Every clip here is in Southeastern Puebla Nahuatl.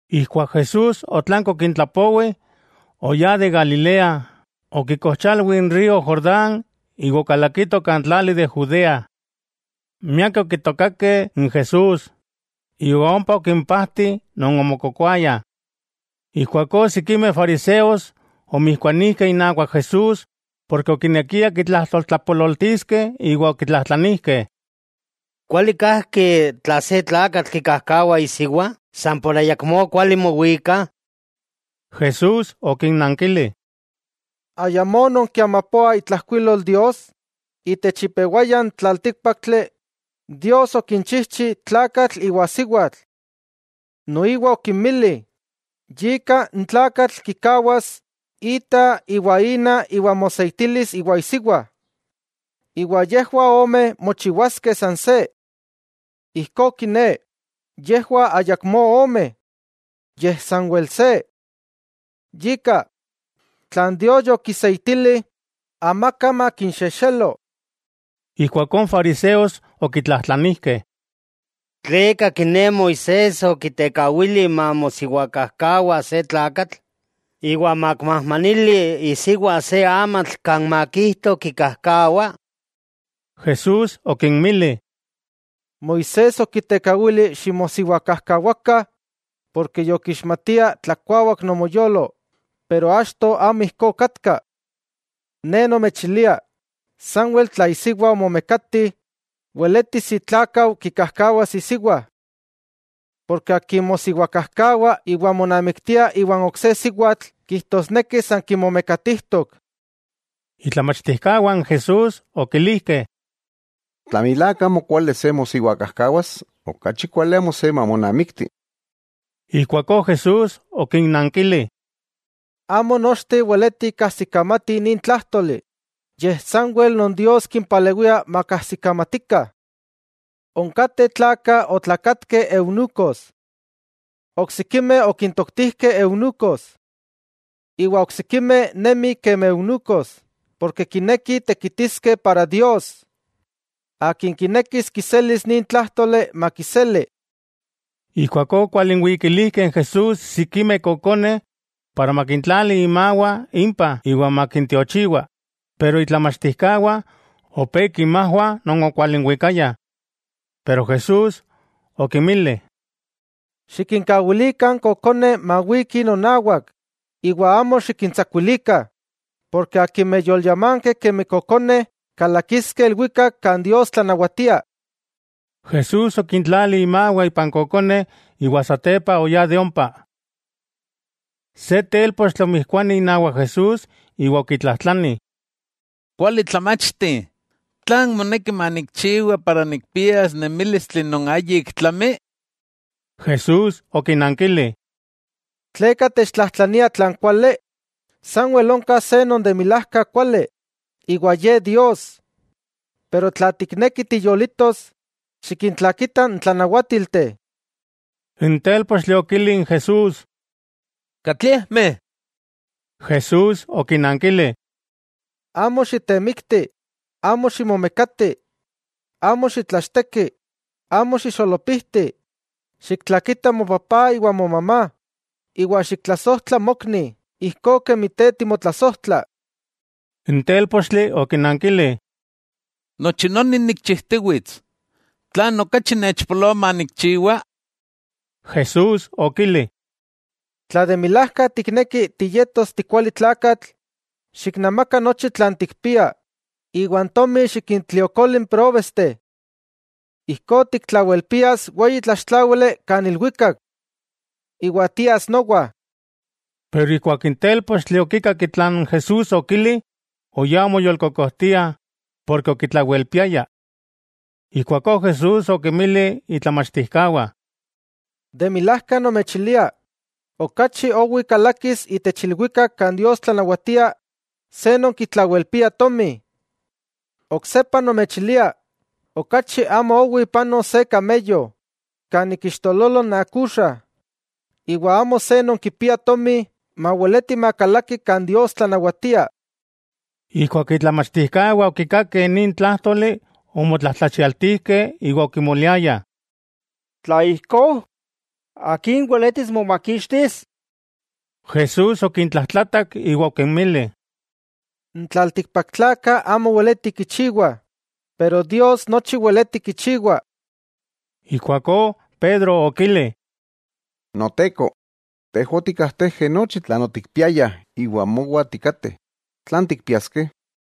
Ijkuak Jesús otlanki okintlapowi, oyá de Galilea, okikojchalwi n río Jordán iwa okalakito kan tlali de Judea. Miakeh okitokakeh n Jesús, iwa ompa okimpajti non omokokoayah. Ijkuakó sikimeh fariseos omijkuanijkeh inawak Jesús porke okinekiah kitlajtoltlapololtiskeh iwa okitlajtlanijkeh: —¿Kuali kajki tla se tlakatl kikajkawa isiwa san por ayakmó kuali mowikah? Jesús okinnankili: —¿Ayamó nonkiamapoah itlajkuilol Dios?, itech ipewaya n tlaltíkpaktli, Dios okinchijchi “tlakatl iwa siwatl.” Noiwa okinmili: “Yika n tlakatl kikawas ita iwa ina iwa moseitilis iwa isiwa, iwa yejwah ome mochiwaskeh san se.” Ijkó kiné, yejwah ayakmó ome, yej sanwel se. Yika, tlan Dios yokiseitili, amaka makinxexelo. Ijkuakó n fariseos okitlajtlanijkeh: —¿Tleka kiné Moisés okitekawili mamosiwakajkawa se tlakatl, iwa makimajmanili isiwa se amatl kan makijto kikajkawa? Jesús okinmili: —Moisés okitekawili ximosiwakajkawakah, porke yokixmatiah tlakuawak nomoyolo; pero achto amo ijkó okatka. Ne nomechilia, sanwel tla isiwa omomekati, weletis itlákau kikajkawas isiwa. Porke akin mosiwakajkawa iwa monamiktia iwan ok se siwatl kijtosneki san kimomekatijtok. Itlamachtijkawah n Jesús okilijkeh: —Tla milák amo kuali se mosiwakajkawas, okachi kuali amo se mamonamikti. Ijkuakó Jesús okinnankili: —Amo nochteh weletih kajsikamatih nin tlájtoli, yej sanwel non Dios kimpalewia makkajsikamatikah. Onkateh tlakah otlakatkeh eunucos. Oksikimeh okintoktijkeh eunucos. Iwa oksikimeh nemih kemi eunucos porke kinekih tekitiskeh para Dios. Akin kinekis kiselis nin tlájtoli, makiseli. Ijkuakó okwalinwikilijkeh n Jesús sikimeh kokoneh para makintlali imawah impah iwa makintiochiwa, pero itlamachtijkawah opé kinmajwah non okwalinwikayah. Pero Jesús okinmili: —Xikinkawilikah n kokoneh mawikih nonawak iwa amo xikintsakuilikah, porke akimeh yolyamankeh kemi kokoneh kalakiskeh ilwikak kan Dios tlanawatia. Jesús okintlali imawah ipan kokoneh iwa satepa oyá de ompa. Se télpochtli omijkuani inawak Jesús iwa okitlajtlani: —Kuali tlamachti, ¿tlan moneki manikchiwa, para nikpias nemílistli non ayik tlami? Jesús okinankili: —¿Tleka techtlajtlania tlan kuali? Sanwel onka se non de milajka kuali, iwa Ye Dios. Pero tla tikneki tiyolitos, xikintlakita n tlanawátilteh. N télpochtli okili n Jesús: —¿Katliejmeh? Jesús okinankili: —Amo xitemikti, amo ximomekati, amo xitlachteki, amo xixolopijti. Xiktlakita mopapá iwa momamá, iwa xiktlasojtla mokni ijkó kemi te timotlasojtla. N télpochtli okinankili: —Nochi noni nikchijtiwits, ¿tlan okachi nechpoloa manikchiwa? Jesús okili: —Tla de milajka tikneki ti yetos ti kuali tlakatl, xiknamaka nochi tlan tikpia iwa n tomi xikintliokoli n próbesteh. Ijkó tiktlawelpias weyi tlaxtláwili kan ilwikak. Iwa tias nowa. Keman n télpochtli okikak tlan Jesús okili, oyá omoyolkokojtia porke okitlawelpiaya. Ijkuakó Jesús okinmili itlamachtijkawah: —De milajka nomechilia, okachi owi kalakis itech ilwikak kan Dios tlanawatia se non kitlawelpia tomi. Oksepa nomechilia, okachi amo owi panos se “kameyo” kan ik ixtololo n akuxa, iwa amo se non kipia tomi maweleti makalaki kan Dios tlanawatia. Ijkuak itlamachtijkawah okikakeh nin tlájtoli, omotlajtlachialtijkeh iwa okimoliayah: —Tla ijkó, ¿akin weletis momakixtis? Jesús okintlajtlatak iwa okinmili: —N tlaltikpaktlakah amo weleti kichiwah, pero Dios nochi weleti kichiwa. Ijkuakó Pedro okili: —Noteko, tejwah otikkajtejkeh nochi tlan otikpiayah iwa mowah tikateh. ¿Tlan tikpiaskeh?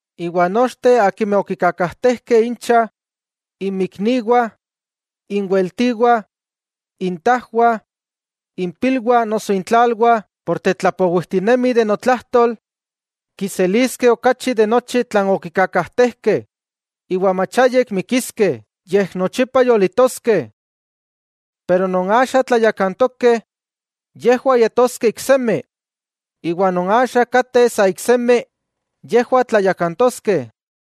Iwa nochteh akimeh okikakajtejkeh incha, inmikniwah, inweltiwah, intajwah, impilwah noso intlalwah por tetlapowijtinemih notlajtol, kiseliskeh okachi de nochi tlan okikakajtejkeh, iwa mach ayik mikiskeh yej nochipa yolitoskeh. Pero non axa tlayakantokeh, yejwah yetoskeh iksemi, iwa non axa kateh sa iksemi, yejwah tlayakantoskeh.